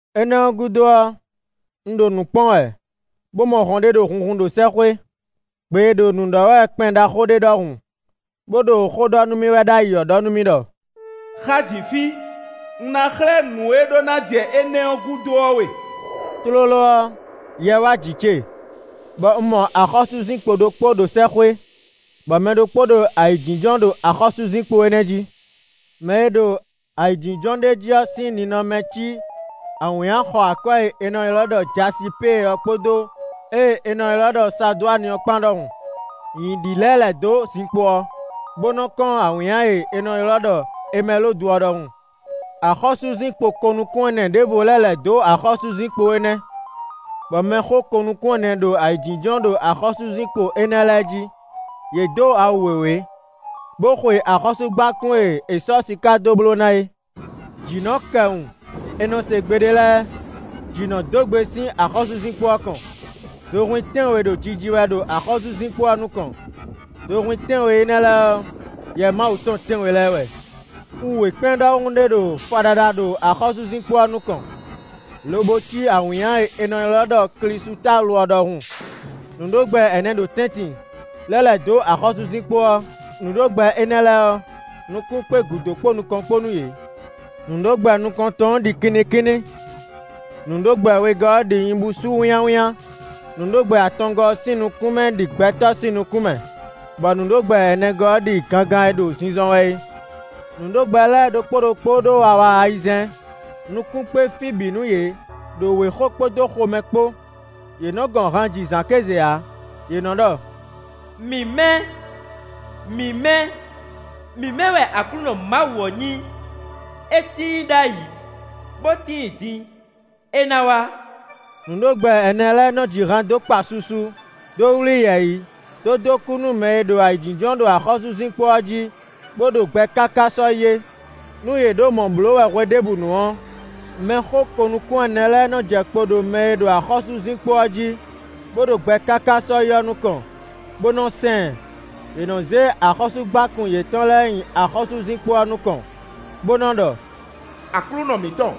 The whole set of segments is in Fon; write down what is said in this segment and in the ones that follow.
Énɛ́ ɔ́ gúdo ɔ́, un ɖo nǔ kpɔ́n wɛ bó mɔ hɔn ɖé ɖo hunhun ɖo sɛ́xwé. Gbe e ɖo nǔ ɖɔ wɛ kpɛn ɖaxó ɖé ɖɔhun, bó ɖo xó ɖɔ nú mì wɛ ɖ'ayǐ ɔ́ ɖɔ nú mì ɖɔ: “Xá jǐ fí, un ná xlɛ́ nǔ e ɖó ná jɛ énɛ́ ɔ́ gúdo ɔ́ we.” Tlóló ɔ́, Yɛ wá jǐ ce, bɔ un mɔ axɔ́súzinkpo ɖokpó ɖo sɛ́xwé, bɔ mɛ ɖokpó ɖo ayǐjínjɔ́n ɖo axɔ́súzinkpo énɛ́ jí. Mɛ e ɖo ayǐjínjɔ́n ɖ'é jí ɔ́ sín ninɔmɛ cí awǐnnya xɔ akwɛ́ e è nɔ ylɔ́ ɖɔ jasipée ɔ́ kpódó ée è nɔ ylɔ́ ɖɔ sadwáni ɔ́ kpán ɖɔhun. Nyǐ ɖi lɛ́ lɛ̌ dó zinkpo ɔ́, bó nɔ kɔ́n awǐnnya e è nɔ ylɔ́ ɖɔ emɛlodu ɔ́ ɖɔhun. Axɔ́súzinkpo ko-nukún-ɛnɛ ɖěvo lɛ́ lɛ̌ dó axɔ́súzinkpo énɛ́, bɔ mɛxó ko-nukún-ɛnɛ ɖo ayǐjínjɔ́n ɖo axɔ́súzinkpo énɛ́ lɛ́ɛ jí. Yě dǒ awu wěwé, bó xwe axɔ́súgbákún e è sɔ́ siká dó bló ná é. Jǐ nɔ kɛ wun, è nɔ se gbe ɖé lɛ́ɛ; jǐ nɔ dó gbe sín axɔ́súzinkpo ɔ́ kɔn. Zohwín tɛ́nwe ɖo jiji wɛ ɖo axɔ́súzinkpo ɔ́ nukɔn; zohwín tɛ́nwe énɛ́ lɛ́ɛ ɔ́, Yɛ Mawu tɔn tɛ́nwe lɛ́ɛ wɛ. Xu wěkpɛ́n ɖɔhun ɖé ɖo faɖaɖa ɖo axɔ́súzinkpo ɔ́ nukɔn, lobo cí awǐnnya e è nɔ ylɔ́ ɖɔ klísutalu ɔ́ ɖɔhun. Nǔɖogbɛ ɛnɛ ɖo tɛ́ntin, lɛ́ lɛ̌ dó axɔ́súzinkpo ɔ́. Nǔɖogbɛ énɛ́ lɛ́ɛ ɔ́, nukún kpé gǔdo kpó nukɔn kpó nú yě. Nǔɖogbɛ nukɔntɔn ɔ́ ɖi kinnikínní; nǔɖogbɛ wegɔ́ ɔ́ ɖi nyibúsú wínnyáwínnyá. Nǔɖogbɛ atɔngɔ́ ɔ́ sín nukún mɛ ɖi gbɛtɔ́ sín nukún mɛ, bɔ nǔɖogbɛ ɛnɛgɔ́ ɔ́ ɖi gangan e ɖo zinzɔn wɛ é. Nǔɖogbɛ lɛ́ɛ ɖokpó ɖokpó ɖó awa ayizɛ́n; nukún kpé fí bǐ nú yě ɖo wěxo kpódó xomɛ kpó. Yě nɔ gɔn han ji zǎn kéze ǎ; yě nɔ ɖɔ: “Mǐmɛ́! Mǐmɛ́! Mǐmɛ́ wɛ Aklúnɔ Mawu ɔ́ nyí; é tíin ɖ'ayǐ, bó tíin din; é ná wá.” Nǔɖogbɛ ɛnɛ lɛ́ɛ nɔ ji han dó kpá susu, dó wlí yɛ̌yi, dó dó kú nú mɛ e ɖo ayǐjínjɔ́n ɖo axɔ́súzinkpo ɔ́ jí, bó ɖo gbɛ káká sɔ́yi é. Nú yě ɖo mɔ̌ bló wɛ hweɖěbǔnu ɔ́, mɛxó ko-nukún-ɛnɛ lɛ́ɛ nɔ jɛ kpo ɖo mɛ e ɖo axɔ́súzinkpo ɔ́ jí, bó ɖo gbɛ káká sɔ́yi ɔ́ nukɔn, bó nɔ sɛn ɛ. Yě nɔ zé axɔ́súgbákún yětɔn lɛ́ɛ nyi axɔ́súzinkpo ɔ́ nukɔn, bó nɔ ɖɔ: “Aklúnɔ mǐtɔn,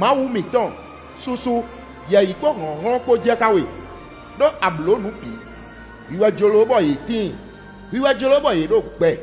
Mawu mǐtɔn, susu, yɛ̌yi kpó hlɔ̌nhlɔ́n kpó jɛ xá we, ɖó a blǒ nǔ bǐ; hwi wɛ jló bɔ yě tíin; hwi wɛ jló bɔ yě ɖo gbɛ.”